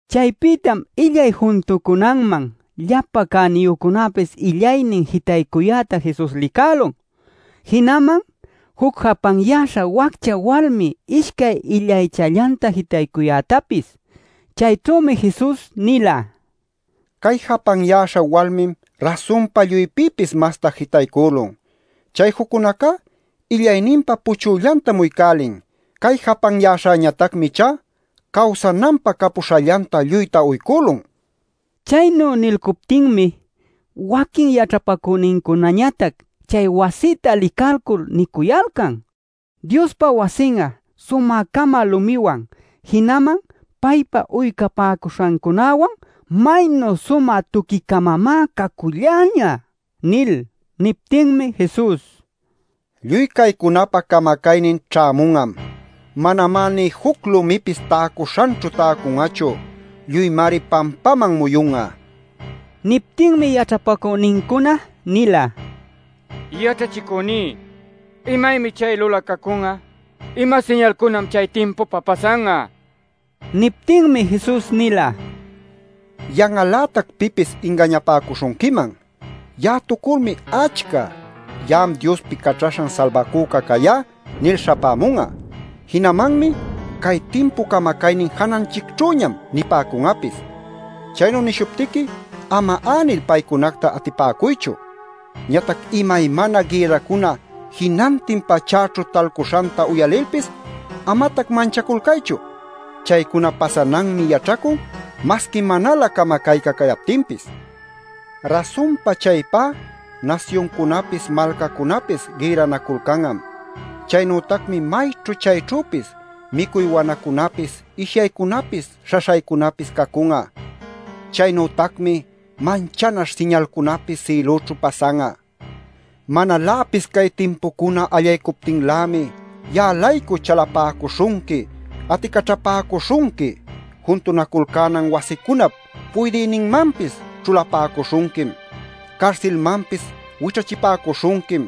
Chaypïtam illay juntucunaman llapa cäniyücunapis illaynin jitaycuyäta Jesus licälun jinaman juc japanyäśha waccha walmi ishcay illaychallanta jitaycuyätapis. Chayćhümi Jesus nila: “Cay japanyäśha walmim rasunpa lluypïpis masta jitaycülun. Chay juccunacá illayninpa puchüllantam uycälin. Cay japanyäśhañatacmi ichá cawsananpä capuśhallanta lluyta uycülun” nil. Chaynu nilcuptinmi waquin yaćhapacünincunañatac chay wasïta licalcul nicuyalcan: “¡Diospa wasin'a sumä-cama lumiwan jinaman paypä uycapäcuśhancunawan maynu sumä tuqui-camamá caculläñä!” nil. Niptinmi Jesus: “Lluy caycunapä camacaynin ćhämun'am. Manamá nï juc lumipis täcuśhanćhu täcun'achu. Lluymari pampaman muyun'a” nila. Niptinmi yaćhapacünincuna nila: “Yaćhachicüní, ¿imaymi chay lulacacun'a? ¿Ima siñalcunam chay timpupä pasan'a?” nil. Niptinmi Jesus nila: “Yan'al-lätac pipis ingañapäcuśhunquiman. Ya'atuculmi achca ‘Ya'am Diospi Caćhaśhan Salbacüca cayá’ nil śhapämun'a. Jinamanmi ‘Cay timpu camacaynin jananchicćhüñam’ nipäcun'apis. Chaynu nishuptiqui ama änil paycunacta atipäcuychu. Ñatac imaymana gïrracuna jinantin pachäćhu talcuśhanta uyalilpis amatac manchaculcaychu. Chaycuna pasananmi yaćhacun masqui manalä camacayca cayaptinpis. Rasunpa chaypá nasyuncunapis malcacunapis gïrranaculcan'am. Chaynütacmi mayćhu chayćhüpis micuy wanacunapis ishyaycunapis śhaśhaycunapis cacun'a. Chaynütacmi manchanaśh siñalcunapis sïlućhu pasan'a. “Manaläpis cay timpucuna allaycuptinlämi ya'a-laycu chalapäcuśhunqui, aticaćhapäcuśhunqui. Juntunaculcänan wasicunap puydïninmanpis ćhulapäcuśhunquim. Carsilmanpis wićhachipäcuśhunquim.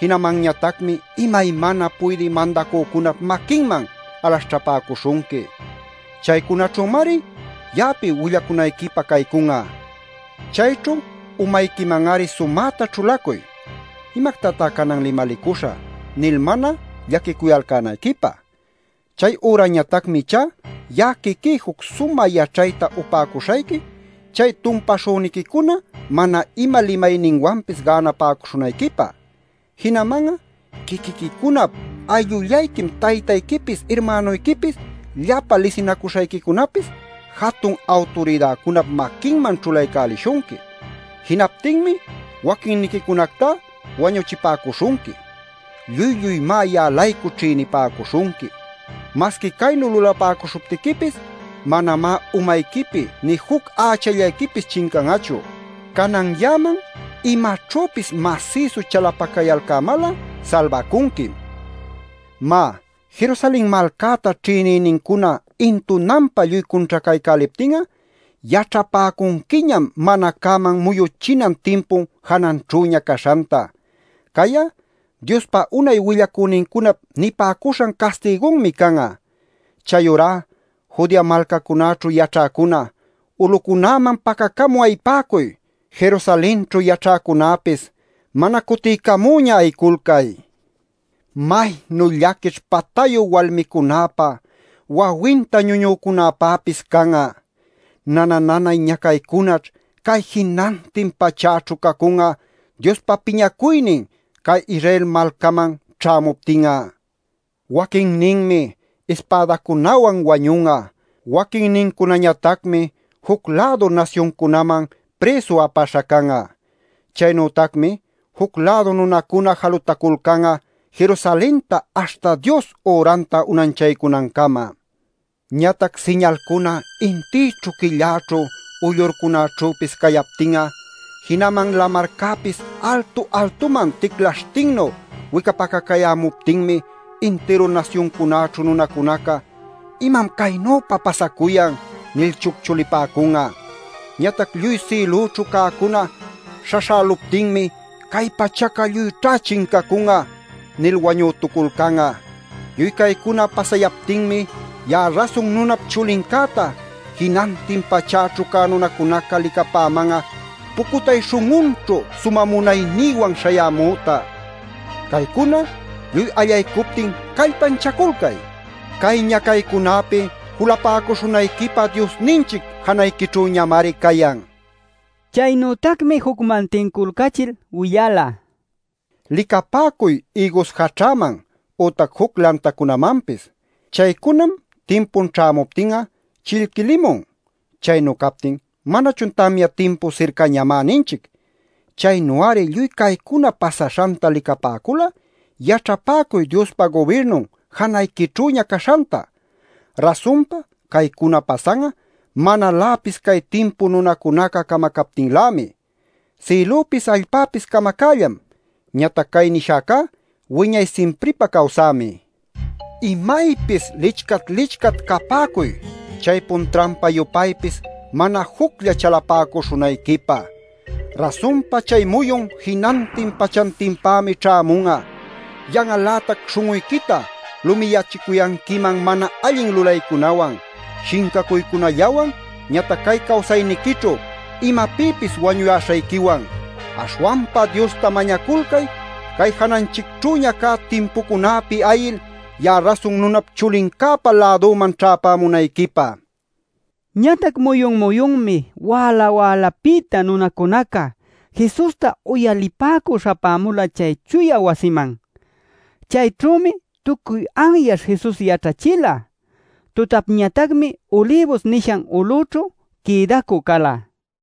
Jinamanñatacmi imaymana puydï mandacücunap maquinman alaśhćhapäcuśhunqui. Caycunaćhümari ya'api willacunayquipä caycun'a. Chayćhu umayquiman-ari sumäta ćhulacuy ‘¿Imactatá canan limalicuśhä?’ nil mana llaquicuyalcänayquipä. Chay ürañatacmi ichá ya'a quiquí juc sumä yaćhayta upäcuśhayqui chay tumpaśhüniquicuna mana ima limayninwanpis gänapäcuśhunayquipä. “Jinaman'a quiquiquicunap ayllullayquim taytayquipis irmänuyquipis llapa lisinacuśhayquicunapis jatun awturidäcunap maquinman ćhulaycälishunqui. Jinaptinmi waquinniquicunactá wañuchipäcuśhunqui. Lluy lluymá ya'a-laycu ćhïnipäcuśhunqui. Masqui caynu lulapäcuśhuptiquipis, manamá umayquipi nï juc ächallayquipis chincan'achu. Canan ya'aman imacunaćhüpis masïsu chalapacayalcämal'a salbacunquim. “Má, Jerusalen malcäta ćhïnïnincuna intunanpa lluy cunćhacaycäliptin'a yaćhapäcunquiñam mana cäman muyuchinan timpun jananćhüña caśhanta. Cay'a Diospa unay willacünincunap nipäcuśhan castigunmi can'a. Chayurá Judea malcacunäćhu yaćhäcuna, ulucunäman pacacamü ayipäcuy. Jerusalenćhu yaćhäcunäpis mana cutiycamüña ayiculcay. ¡Maynu llaquićh patayu walmicunäpä, wawinta ñuñücunäpäpis can'a! Nana nanay ñacaycunaćh cay jinantin pachäćhu cacun'a Diospa piñacuynin cay Israel malcaman ćhämuptin'a. Waquinninmi ispädacunawan wañun'a. Waquinnincunañatacmi juc-lädu nasyuncunaman prïsu apaśha can'a. Chaynütacmi juc-lädu nunacuna jalutaculcan'a Jerusalenta aśhta Dios üranta unanchaycunancama. “Ñatac siñalcuna intïćhu quilläćhu uyllurcunaćhüpis cayaptin'a jinaman lamarcäpis altu altuman ticlaśhtinnu wicapacacayämuptinmi intiru nasyuncunaćhu nunacunaca ‘¿Imam caynüpa pasacuyan?’ nil chucchulipäcun'a. Ñatac lluy sïlućhu cäcuna śhaśhäluptinmi ‘¡Cay pachaca lluyćha chincacun'a!’ nil wañütuculcan'a. Lluy caycuna pasayaptinmi ya'a Rasun Nunap Chulincäta jinantin pachäćhu cä nunacunaca licapäman'a pucutay śhun'unćhu sumä munaynïwan śhayämüta. Caycuna lluy allaycuptin callpanchaculcay. Cay ñacaycunäpi julapäcuśhunayquipä Diosninchic janayquićhüñamari cayan” nil. Chaynütacmi jucman tinculcachil willala: “Licapäcuy ïgus jaćhäman ütac juc lantacunamanpis. Chaycunam timpun ćhämuptin'a chillquilimun. Chaynu captin ¿manachun ‘Tamya timpu sircañamá’ ninchic? Chaynu-ari lluy caycuna pasaśhanta licapäcul'a yaćhapäcuy Diospa gubirnun janayquićhüña caśhanta. Rasunpa caycuna pasan'a manaläpis cay timpu nunacunaca camacaptinlämi. Sïlüpis allpäpis camacällam, ñatac cay nishäcá wiñay simpripä cawsämi. “Imaypis licchat-licchat capäcuy chaypun trampa-yupaypis mana juclla chalapäcuśhunayquipä. Rasunpa chay muyun jinantin pachantinpämi ćhämun'a. Yan'al-lätac śhun'uyquita lumiyächicuyanquiman mana allin lulaycunawan, shincacuycunallawan ñatac cay cawsayniquićhu imapïpis wañuyäśhayquiwan. Aśhwanpa Diosta mañaculcay cay jananchicćhüña cä timpucunäpi ayil ya'a Rasun Nunap Chulincäpa lädüman ćhäpämunayquipä” nil. Ñatac muyun-muyunmi wäla-wälapïta nunacunaca Jesusta uyalipäcü śhapämula chay chuya wasiman. Chayćhümi tucuy anyaśh Jesus yaćhachila. Tutapñatacmi Ulibus nishan ulüćhu quïdacü cala.